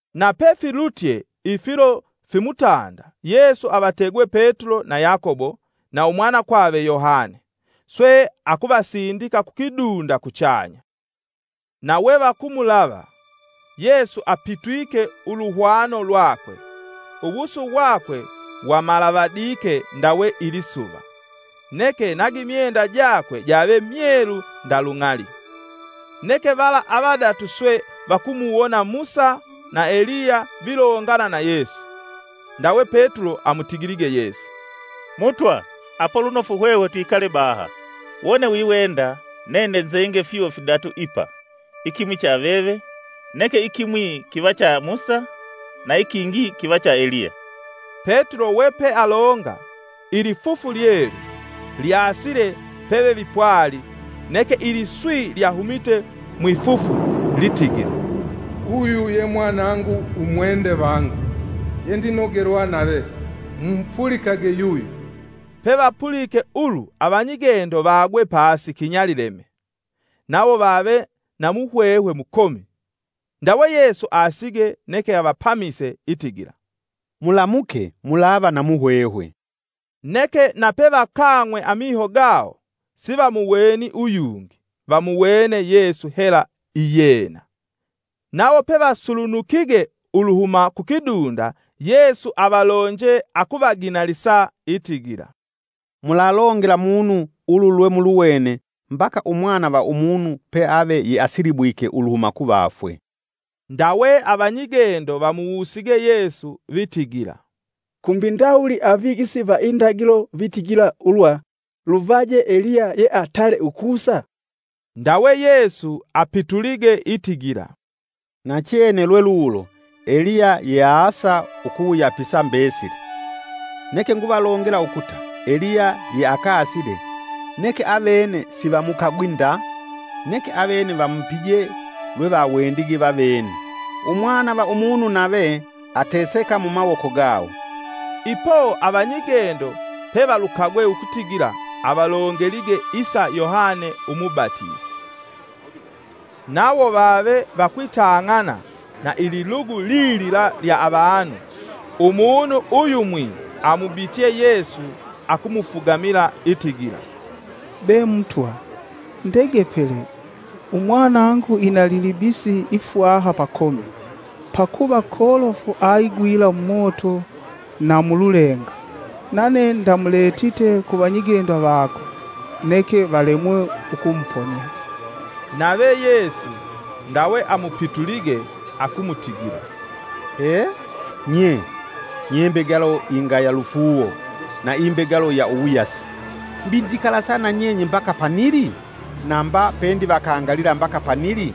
Na pefilutye ifilo fimutanda Yesu avategwe Petulo na Yakobo na umwanakwave Yohane, swe akuvasindika kukidunda kuchanya. Na wevakumulava, Yesu apitwike uluhwano lwake, uwusu wakwe wamalavadike ndawe ilisuva, neke na gimyenda jakwe jave myelu nda lung'ali. Neke vala avadatu swe vakumuwona Musa na Eliya vilongana na Yesu. Ndawe Petulo amutigilige Yesu, “Mutwa apo lunofu hwehwe twikale baha! Wone wiwenda nene nzenge fyuwo fidatu ipa, ikimwi cha veve, neke ikimwi kiva cha Musa na ikingi kiva cha Eliya.” Petulo we pealonga, ilifufu lyelu lyaasile pevevipwali neke iliswi lyahumite mwifufu litigila, “Uyu ye Mwanangu umwende vangu, yendinogelwa nave, mu mupulikage yuyo.” Pevapulike ulu avanyigendo vagwe pasi kinyalileme nawo vave na muhwehwe mukomi. Ndawe Yesu aasige neke avapamise, itigila, “Mulamuke mulava na muhwehwe.” Neke na pevakang'we amiho gawo sivamuweni uyungi, vamuwene Yesu hela iyena. Nawo pevasulunukige uluhuma kukidunda Yesu avalonje akuvaginalisa itigila, “Mulalongela munu ulu lwe muluwene mbaka Umwana va Umunu peave yeasilibwilwe uluhuma kuvafwe.” Ndawe avanyigendo vamuwusige Yesu vitigila, “Kumbi ndawuli avigisi va indagilo vitigila ulwa luvaje Eliya yeatale ukusa?” Ndawe Yesu apitulige itigila, “Nachene lwelulo, Eliya yeaasa ukuwuyapisa mbesili. Neke nguvalongela ukuta, Eliya yeakasile, neke avene sivamukagwi nda, neke avene vamupije lwevawendige vavene. Umwana va Umunu nave, ateseka mumawoko gawo.” Ipo avanyigendo pevalukagwe ukutigila, avalongelige isa Yohane umubatisi. Nawo vave vakwitang'ana na ililugu lilila lya avanu, umunu uyumwi amubitye Yesu akumufugamila itigila, “Be Mutwa, ndegepele umwanangu ina ililibisi ifwaha pakomi, pakuva kolofu aigwila mumoto na mululenga. Nane ndamuletite ku vanyigendo vako, neke valemwe ukumuponia.” Nave Yesu ndawe amupitulige akumutigila, “He! Nye, nye mbegalo ingaya lufuuwo, na imbegalo ya uwuyasi! Mbi ndikalasa na nyenye mbaka panili? Na mba pendivakangalila mbaka panili?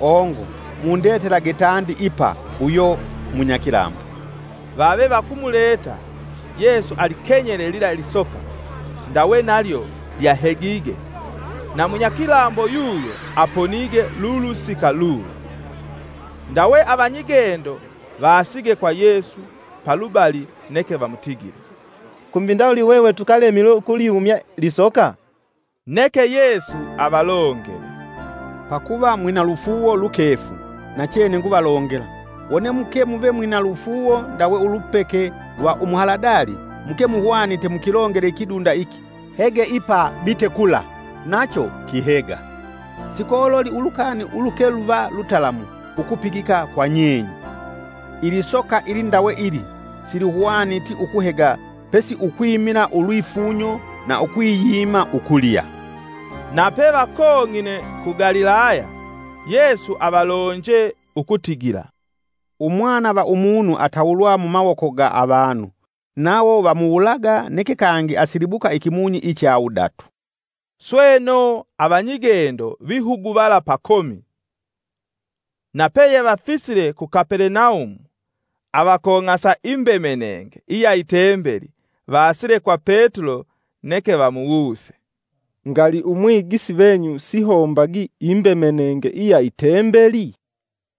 Ongo mundetelage tandi ipa uyo munyakilambo.” Vave vakumuleta, Yesu alikenyele lila lisoka, ndawe nalyo lyahegige, na munyakilambo yuyo aponige lulusika lulo. Ndawe avanyigendo vaasige kwa Yesu palubali neke vamutigile, “Kumbi ndawuli hwehwe tukalemilwe ukulihumya lisoka?” Neke Yesu avalongele, “Pakuva mwina lufuuwo lukefu. Nachene nguvalongela, wone muke muve mwina lufuuwo ndawe ulupeke lwa umuhaladali, muke muhwanite mukilongele ikidunda iki, ‘Hege ipa bite kula,’ nacho kihega. Sikololi ulukani uluke luva lutalamu ukupigika kwa nyenye.” [ “Ilisoka ilindawe ili, silihwaniti ukuhega pesi ukwimila ulwifunyo na ukwiyima ukulya.]” Na pevakong'ine ku Galilaya, Yesu avalonje ukutigila, “Umwana va Umunu atawulwa mumawoko ga avanu. Nawo vamuwulaga, neke kangi asilibuka ikimunyi icha wudatu.” Sweno avanyigendo vihuguvala pakomi. Na peyevafisile ku Kapelenaumu, avakong'asa imbemenenge iya itembeli vaasile kwa Petulo neke vamuwuse, “Ngali Umwigisi venyu sihombagi imbemenenge iya itembeli?”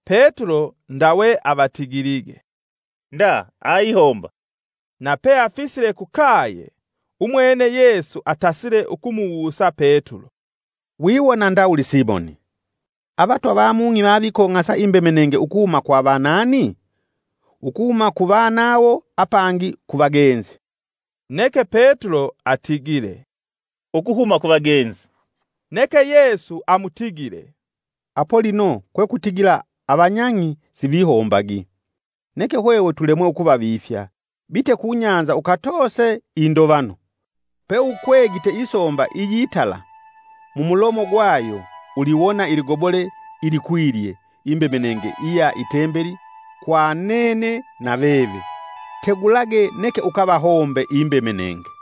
Petulo ndawe avatigilige, “Nda aihomba.” Na peafisile kukaye, umwene Yesu atasile ukumuwusa Petulo, “Wiwona ndawuli Simoni? Avatwa va mung'i vavikong'asa imbemenenge ukuhuma kwa vanani? Ukuhuma ku vanawo apangi ku vagenzi.” Neke Petulo atigile, “Ukuhuma kuvagenzi.” Neke Yesu amutigile, “Apo lino kwekutigila avanyang'i sivihombagi. Neke hwehwe tulemwe ukuvavifya, bite ku nyanza ukatoose indovano. Pe ukwegite isomba iyitala, mumulomo gwayo uliwona iligobole ilikwilye imbemenenge iya itembeli kwa nene na veve. Tegulage neke ukavahombe imbemenenge!”